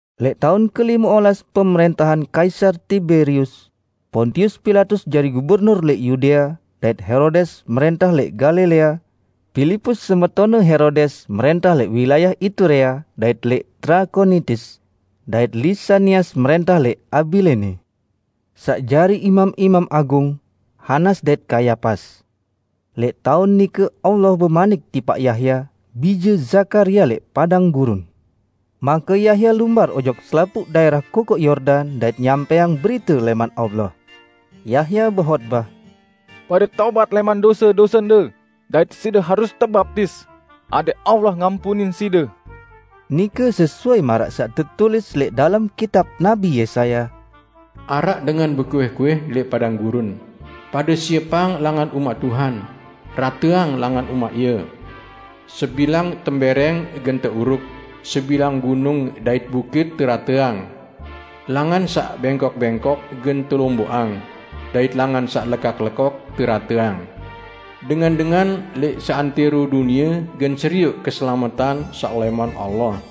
Lẽq taun kelime olas pemrẽntahan Kaisar Tiberius, Pontius Pilatus jari gubernur lẽq Yudea, dait Herodes mrẽntah lẽq Galilea, Pilipus semetonne Herodes mrẽntah lẽq wilayah Iturea dait lẽq Trakonitis, dait Lisanias mrẽntah lẽq Abilene. Saq jari imam-imam agung, Hanas dait Kayapas. Lẽq taun nike Allah bemanik tipaq Yahya, bije Zakaria lẽq padang gurun. Make Yahya lumbar ojok selapuq daẽrah Kokoq Yordan dait nyampẽang berite lẽman Allah. Yahya behotbah, "Pade tobat lẽman dose-dosende, dait side harus tebaptis, adẽq Allah ngampunin side." Nike sesuai maraq saq tetulis lẽq dalem kitab Nabi Yesaya: "Araq dengan bekuih-kuih lẽq padang gurun, 'Pade siepang langan umaq Tuhan, rateang langan umaq Ie. Sembilang tembẽrẽng gen teuruk, sebilang gunung dait bukit terateang. Langan saq bẽngkok-bẽngkok gen telomboqang, dait langan saq lekok-lekok terateang. Dengan-dengan lẽq seantẽro dunie gen serioq keselametan saq lẽman Allah!' "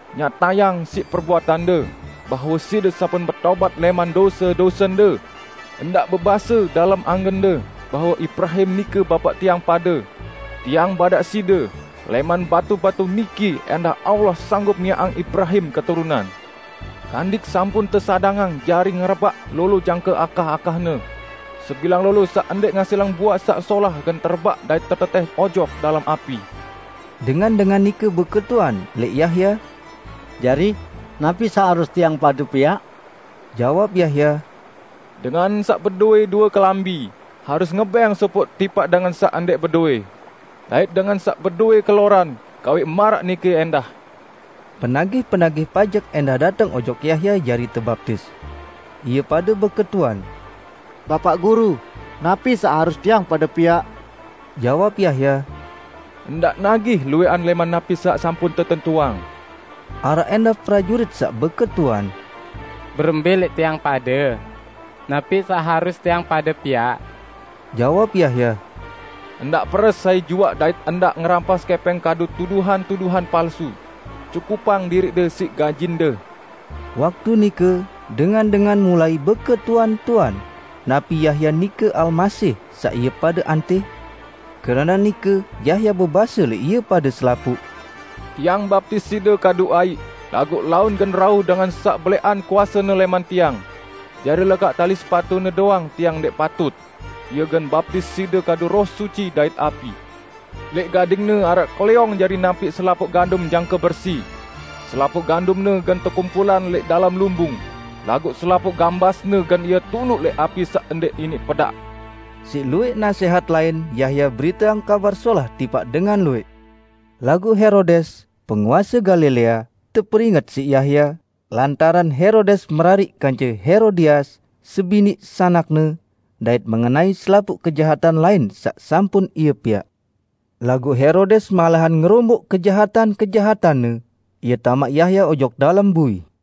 Nyatayang siq perbuatande bahwe side sampun betobat lẽman dose-dosende! Ndaq bebase dalem angende bahwe Ibrahim nike bapaq tiang pade. Tiang badaq side: Lẽman batu-batu niki ẽndah Allah sanggup miaqang Ibrahim keturunan. Kandik sampun tesadangang jari ngerebaq lolo jangke akah-akahne. Sebilang lolo saq ndẽq ngasilang buaq saq solah gen terebaq dait tetetẽh ojok dalem api!" Dengan-dengan nike beketuan lẽq Yahya, "Jari, napi saq harus tiang pade piaq?" Jawab Yahya, "Dengan saq bedowẽ due kelambi, harus ngebẽng sopoq tipaq dengan saq ndẽq bedowẽ; dait dengan saq bedowẽ keloran, gawẽq maraq nike ẽndah." Penagih-penagih pajek ẽndah dateng ojok Yahya jari tebaptis. Ie pade beketuan, "Bapaq Guru, napi saq harus tiang pade piaq?" Jawab Yahya, "Ndaq nagih luwẽqan lẽman napi saq sampun tetentuang." Araq ẽndah prajurit saq beketuan, "Berembẽ lẽq tiang pade? Napi saq harus tiang pade piaq?" Jawab Yahya, "Ndaq peres sai juaq dait ndaq ngerampas kẽpẽng kadu tuduhan-tuduhan palsu. Cukupang diriqde siq gajinde!" Waktu nike, dengan-dengan mulai beketuan-tuan, napi Yahya nike Almasih saq ie pade antih. Keranaq nike Yahya bebase lẽq ie pade selapuq, "Tiang baptis side kadu aiq, laguq laun gen rauh Dengan saq belẽqan kuasene lẽman tiang. Jari lekaq tali sepatu-Ne doang tiang ndẽq patut. Ie gen baptis side kadu Roh Suci dait api. Lẽq gading-Ne araq klẽong jari nampiq selapuq gandum jangke bersi. Selapuq gandumne gen tekumpulang lẽq dalem lumbung, laguq selapuq gambasne gen Ie tunuq lẽq api saq ndẽq iniq pedaq!" Siq luwẽq nasẽhat lain Yahya beriteang Kabar Solah tipaq dengan luwẽq. Laguq Herodes, penguase Galilea, teperinget siq Yahya, lantaran Herodes merariq kance Herodias, sebiniq sanakne, dait mengenai selapuq kejahatan lain saq sampun ie piaq. Laguq Herodes malahan ngeromboq kejahatan-kejahatanne, ie tamaq Yahya ojok dalem bui.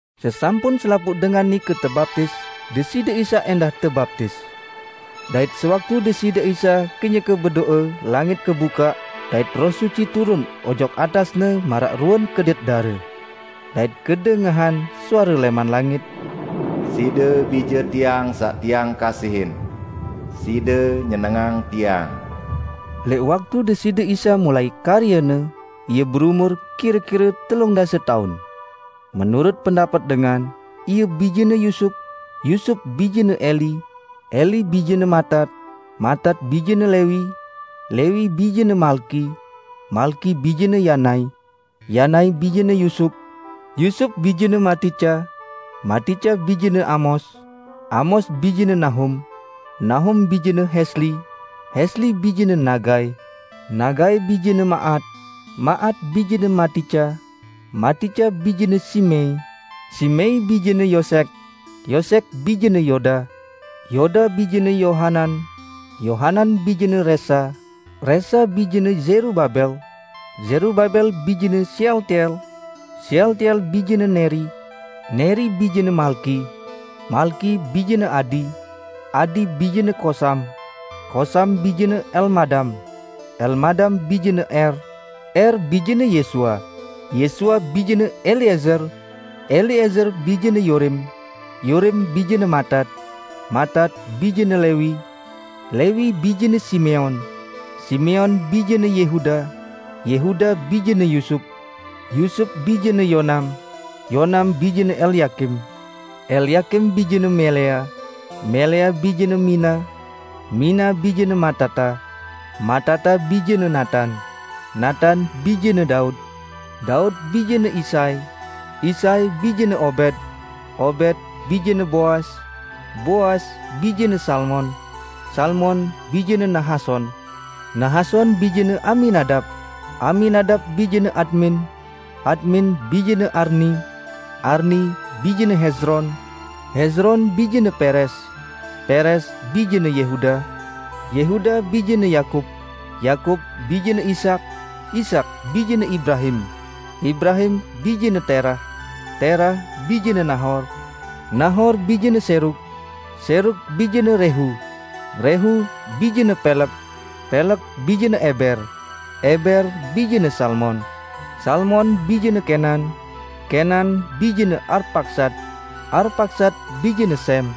Sesampun selapuq dengan nike tebaptis, Deside Isa ẽndah tebaptis. Dait sewaktu Deside Isa kenyeke bedo'e, langit kebukaq, dait Roh Suci turun ojok atas-Ne maraq ruen kedit dare. Dait kedengahan suare lẽman langit, "Side Bije Tiang saq Tiang kasihin. Side nyenengang Tiang." Lẽq waktu Deside Isa mulai karye-Ne, Ie beumur kire-kire telung dase taun. Menurut pendapet dengan, Ie bijene Yusup, Yusup bijene Eli, Eli bijene Matat, Matat bijene Lewi, Lewi bijene Malki, Malki bijene Yanai, Yanai bijene Yusup, Yusup bijene Matica, Matica bijene Amos, Amos bijene Nahum, Nahum bijene Hesli, Hesli bijene Nagai, Nagai bijene Maat, Maat bijene Matica, Matica bijene Simei, Simei bijene Yosek, Yosek bijene Yoda, Yoda bijene Yohanan, Yohanan bijene Resa, Resa bijene Zerubabel, Zerubabel bijene Sealtiel, Sealtiel bijene Neri, Neri bijene Malki, Malki bijene Adi, Adi bijene Kosam, Kosam bijene Elmadam, Elmadam bijene Er, Er bijene Yesua, Yesua bijene Eliezer, Eliezer bijene Yorim, Yorim bijene Matat, Matat bijene Lewi, Lewi bijene Simeon, Simeon bijene Yehuda, Yehuda bijene Yusup, Yusup bijene Yonam, Yonam bijene Elyakim, Elyakim bijene Melea, Melea bijene Mina, Mina bijene Matata, Matata bijene Natan, Natan bijene Daud, Daud bijene Isai, Isai bijene Obed, Obed bijene Boas, Boas bijene Salmon, Salmon bijene Nahason, Nahason bijene Aminadab, Aminadab bijene Admin, Admin bijene Arni, Arni bijene Hezron, Hezron bijene Perez, Perez bijene Yehuda, Yehuda bijene Yakub, Yakub bijene Ishak, Ishak bijene Ibrahim, Ibrahim bijene Terah, Terah bijene Nahor, Nahor bijene Serug, Serug bijene Rehu, Rehu bijene Peleg, Peleg bijene Eber, Eber bijene Salmon, Salmon bijene Kenan, Kenan bijene Arpaksad, Arpaksad bijene Sem,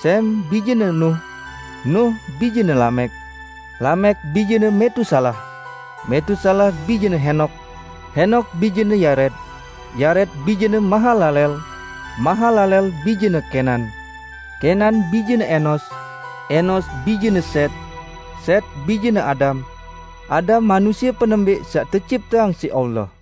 Sem bijene Nuh, Nuh bijene Lamek, Lamek bijene Metusalah, Metusalah bijene Henok, Henok bijene Yared, Yared bijene Mahalaleel, Mahalaleel bijene Kenan, Kenan bijene Enos, Enos bijene Set, Set bijene Adam, Adam manusie penembẽq saq tecipteang siq Allah.